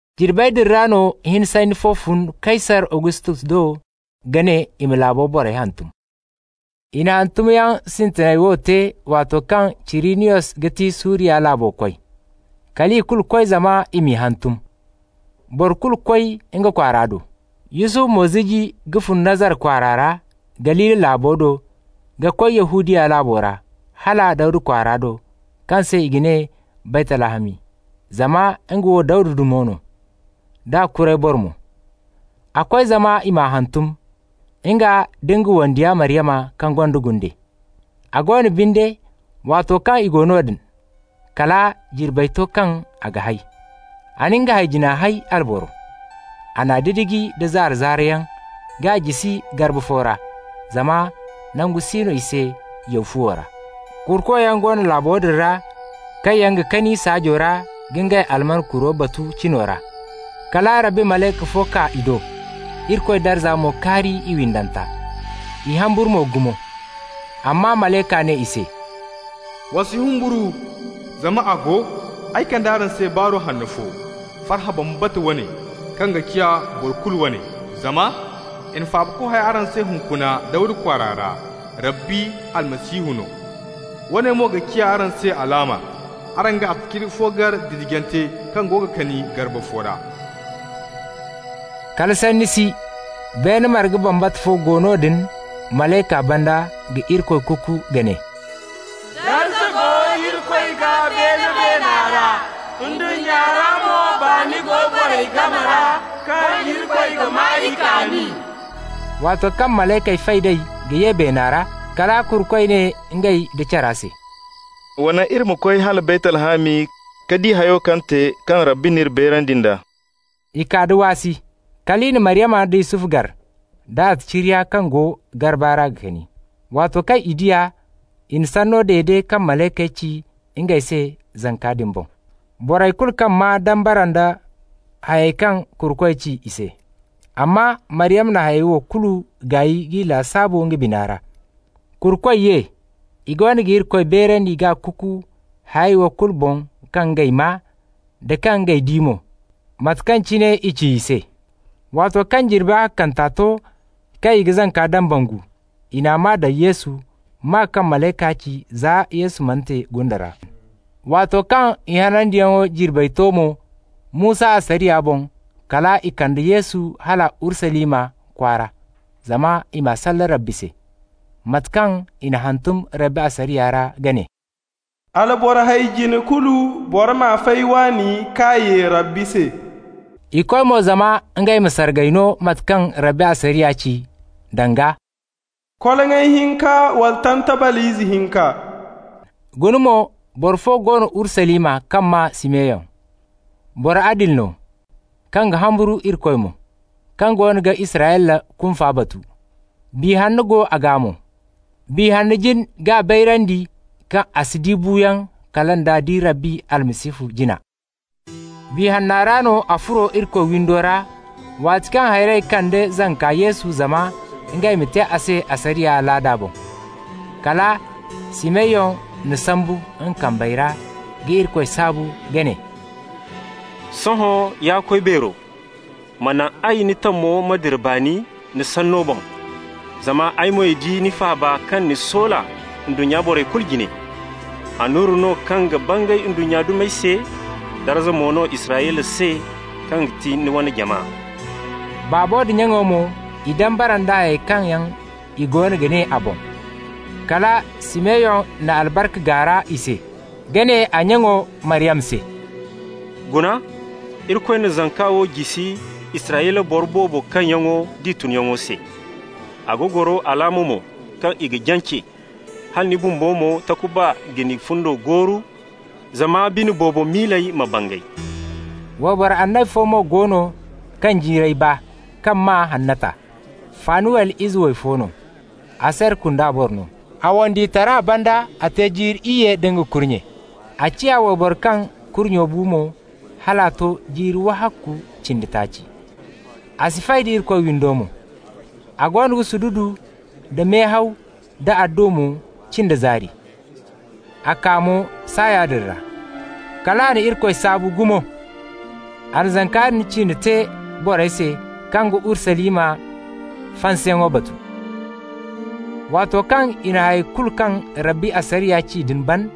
Jirbey din ra no hini sanni fo fun Kaysar Agustos do ka ne i ma laabey borey hantum. I na hantumyaŋ sintinay wo te waato kaŋ Cirinyos ga ti Suriya laabo koy. Kal i kulu koy zama i m'i hantum, boro kulu koy nga kwaara do. Yusufu mo ziji ka fun Nazara kwaara ra, Galili laabo do, ka koy Yahudiya laabo ra, hala Dawda kwaara do, kaŋ se i ga ne Baytlahami, zama nga wo Dawda dumi no, d'a kuray boro mo. A koy zama i m'a hantum, nga nda nga wandiyo Maryama, kaŋ gonda gunde. A go no binde, waato kaŋ i go noodin, kala jirbey to kaŋ a ga hay. A na nga hay-jina hay, alboro. A n'a didiji nda zaara-zaarayaŋ k'a jisi garba fo ra, zama nangu si no i se yaw fuwo ra. Kurukoyaŋ go no laabo din ra, kaŋ yaŋ ga kani saajo ra ka ngey alman kuro batu cino ra. Kala Rabbi malayka fo kaa i do, Irikoy darza mo kaari i windanta. I humburu mo gumo. Amma malayka ne i se: «Wa si humburu, zama a go, ay kande araŋ se baaru hanno fo, farhã bambata wane, kaŋ ga ciya boro kulu wane. Zama i na Faabako hay araŋ se hunkuna Dawda kwaara ra, Rabbi Almasihu no. Woone mo ga ciya araŋ se alaama: araŋ ga attaciriya fo gar didijante kaŋ go ga kani garba fo ra.» Kala sanni si, beene marga bambata fo go noodin malayka banda ga Irikoy kuku ka ne: «Darza go Irikoy gaa beene beena ra, ndunnya ra mo baani go borey game ra, kaŋ Irikoy ga maa i kaani.» Waato kaŋ malaykey fay d'ey ka ye beena ra, kala kurukoy ne ngey nda cara se: «Wa naŋ iri ma koy hala Baytlahami ka di hayo kaŋ te, kaŋ Rabbi n'iri bayrandi nd'a.» I kaa da waasi. Kal i na Maryama nda Yusufu gar, da attaciriya kaŋ go garba ra ga kani. Waato kaŋ i di a, i na sanno dede kaŋ malaykey ci ngey se zanka din boŋ. Borey kulu kaŋ maa dambara nda hayey kaŋ kurukoy ci i se. Amma Maryama na hayey wo kulu gaay k'i lasaabu nga bina ra. Kurukoy ye, i goono ga Irikoy beerandi k'a kuku hayey wo kulu boŋ kaŋ ngey maa, da kaŋ ngey di mo, mate kaŋ cine i ci i se. Waato kaŋ jirbi ahakkanta to kaŋ i ga zanka dambangu, i n'a maa daŋ Yesu, maa kaŋ malayka ci za Yesu mana te gunda ra. Waato kaŋ i hanandiyaŋo jirbey to mo, Musa asariya boŋ, kal i konda Yesu hala Urusalima kwaara zama i m'a salle Rabbi se. Mate kaŋ i n'a hantum Rabbi asariya ra ka ne: «Alboro hay-jine kulu, boro m'a fay waani k'a ye Rabbi se.» I koy mo zama ngey ma sargay no mate kaŋ Rabbi asariya ci, danga: «Koloŋay hinka wala tantabal ize hinka.» Guna mo, boro fo go no Urusalima kaŋ maa Simeyon. Boro adili no, kaŋ ga humburu Irikoy mo, kaŋ goono ga Israyla kunfa batu. Biya Hanno go a gaa mo. Biya Hanna jin k'a bayrandi kaŋ a si di buuyaŋ kala nd'a di Rabbi Almasihu jina. Biya Hanna ra no a furo Irikoy windo ra waato kaŋ hayrey kande zanka Yesu zama ngey ma te a se asariya alaada boŋ. Kala Simeyon n'a sambu nga kambey ra ka Irikoy saabu ka ne: «Sohõ, ya Koy Beero, ma naŋ ay, ni tamo ma dira baani, ni sanno boŋ. Zama ay moy di ni faaba kaŋ ni soola ndunnya borey kulu jine. Annura no kaŋ ga bangay ndunnya dumey se, darza mo no Israyla se, kaŋ ga ti ni wane jama.» Baabo da nyaŋo mo, i dambara nda hayey kaŋ yaŋ i goono ga ne a boŋ. Kala Simeyon na albarka gaara i se, ka ne a nyaŋo, Maryama se: «Guna, Irikoy na zanka wo jisi Israyla boro boobo kaŋyaŋo d'i tunyaŋo se. A ga goro alaama mo kaŋ i ga jance. Hala ni bumbo mo, takuba ga ni fundo gooru, zama bine boobo miiley ma bangay.» Wayboro annabi fo mo go no, kaŋ jiirey baa, kaŋ maa Hannata. Fanuwel ize way fo no, Aser kunda boro no. A wandiyotara banda a te jiiri iyye da nga kurnye. A ciya wayboro kaŋ kurnye bu mo hal a to jiiri wahakku cindi taaci. A si fay da Irikoy windo mo. A goono ga sududu nda mehaw da adduwa mo cin da zaari. A kaa mo saaya din ra. Kal a na Irikoy saabu gumo. A na zanka din ciine te borey se kaŋ ga Urusalima fansayaŋo batu. Waato kaŋ i na hayey kulu kaŋ Rabbi asariya ci din ban,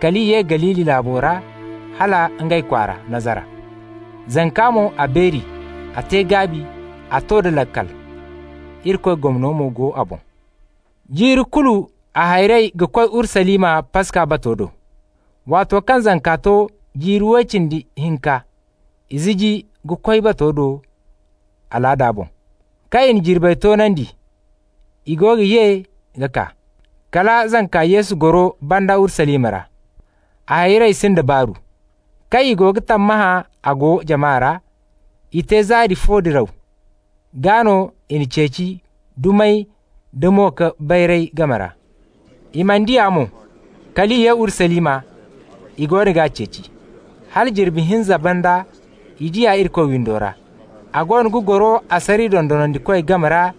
kal i ye Galili laabo ra hal ngey kwaara, Nazara. Zanka mo, a beeri, a te gaabi, a to da laakal. Irikoy gomno mo go a boŋ. Jiiri kulu a hayrey ga koy Urusalima Paska bato do. Waato kaŋ zanka to jiiri way cindi hinka, i ziji ka koy bato do alaada boŋ. Kaŋ i na jirbey toonandi, i goono ga ye ka kaa, kala zanka Yesu goro banda Urusalima ra. A hayrey sind'a baaru. Kaŋ i go ga tammahã a go jama ra, i te zaari fo diraw, gaa no i n'a ceeci dumey da mo-ka-bayrayey game ra. I mana di a mo, kal i ye Urusalima, i goono g'a ceeci. Hala jirbi hinza banda i di a Irikoy windo ra. A goono ga goro asariya dondonandikoy game ra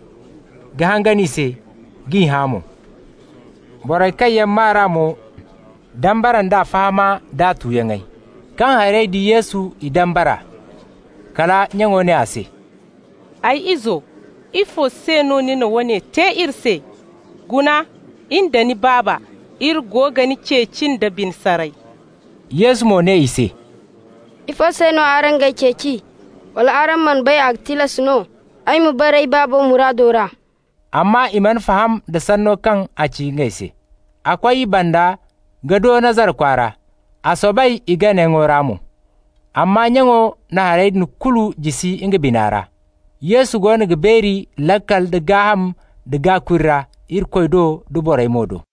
ka hangan i se, g'i hã mo. Borey kaŋ yaŋ maa r'a mo dambara nd'a fahama d'a tuyaŋey. Kaŋ hayrey di Yesu, i dambara. Kala nyaŋo ne a se: «Ay izo, ifo se no ni na woone te iri se? Guna, in da ni baaba, iri go ga ni ceeci nda bine saray.» Yesu mo ne i se: «Ifo se no araŋ g'ay ceeci? Wala araŋ mana bay a ga tilas no ay ma bara ay Baabo muraado ra?» Amma i mana faham da sanno kaŋ a ci ngey se. A koy i banda ka do Nazara kwaara, a soobay i ganayaŋo ra mo. Amma nyaŋo na hayey din kulu jisi nga bina ra. Yesu goono ga beeri laakal da gaaham da gaakuri ra, Irikoy do da borey mo do.